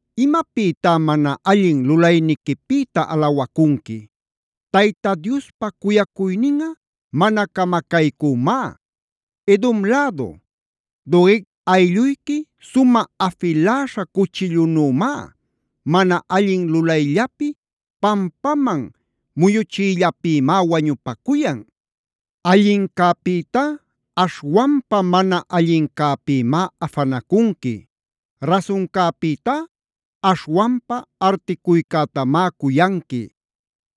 ¿imapïtá mana allin lulayniquipïta alawacunqui? ¡Tayta Diospa cuyacuyninꞌa mana camacaycümá! Edom lädu, Doeg alluyqui sumä afiläśha cuchillunümá. Mana allin lulayllapi, pampaman muyuchiyllapïmá wañupacuyan. Allincäpïtá aśhwanpa mana allincäpïmá afanacunqui. Rasuncäpïtá aśhwanpa articuycätamá cuyanqui.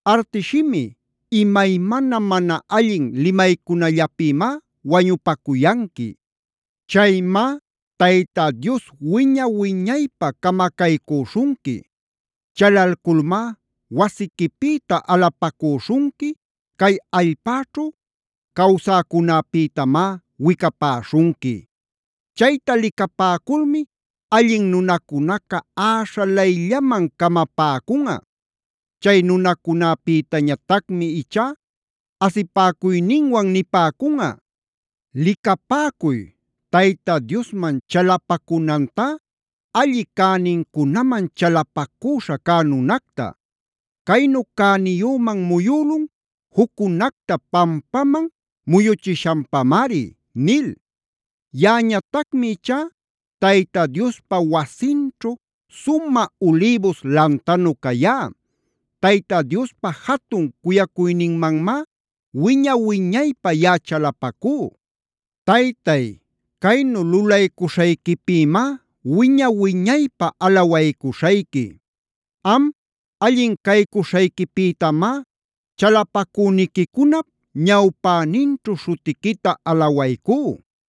Artish shimi, imaymana mana allin limaycunallapïmá wañupacuyanqui. Chaymá Tayta Dios wiña-wiñaypä camacaycüśhunqui. Chalalculmá wasiquipïta alapacüśhunqui, cay allpäćhu cawsäcunäpïtamá wicapäśhunqui. Chayta licapäculmi allin nunacunaca äśhalayllaman camapäcunꞌa. Chay nunacunäpïtañatacmi ichá asipäcuyninwan nipäcunꞌa: “Licapäcuy, Tayta Diosman chalapacunantá alli cänincunaman chalapacüśha cä nunacta. Caynu cäniyüman muyülun juccunacta pampaman muyuchishanpamari” nil. Yaꞌañatacmi ichá Tayta Diospa wasinćhu sumä ulïbus lantanu cayá. Tayta Diospa jatun cuyacuyninmanmá wiña-wiñaypä yaꞌa chalapacú. Taytay, caynu lulaycuśhayquipïmá wiña-wiñaypä alawaycuśhayqui. Am, allin caycuśhayquipïtamá chalapacüniquicunap ñawpäninćhu śhutiquita alawaycú.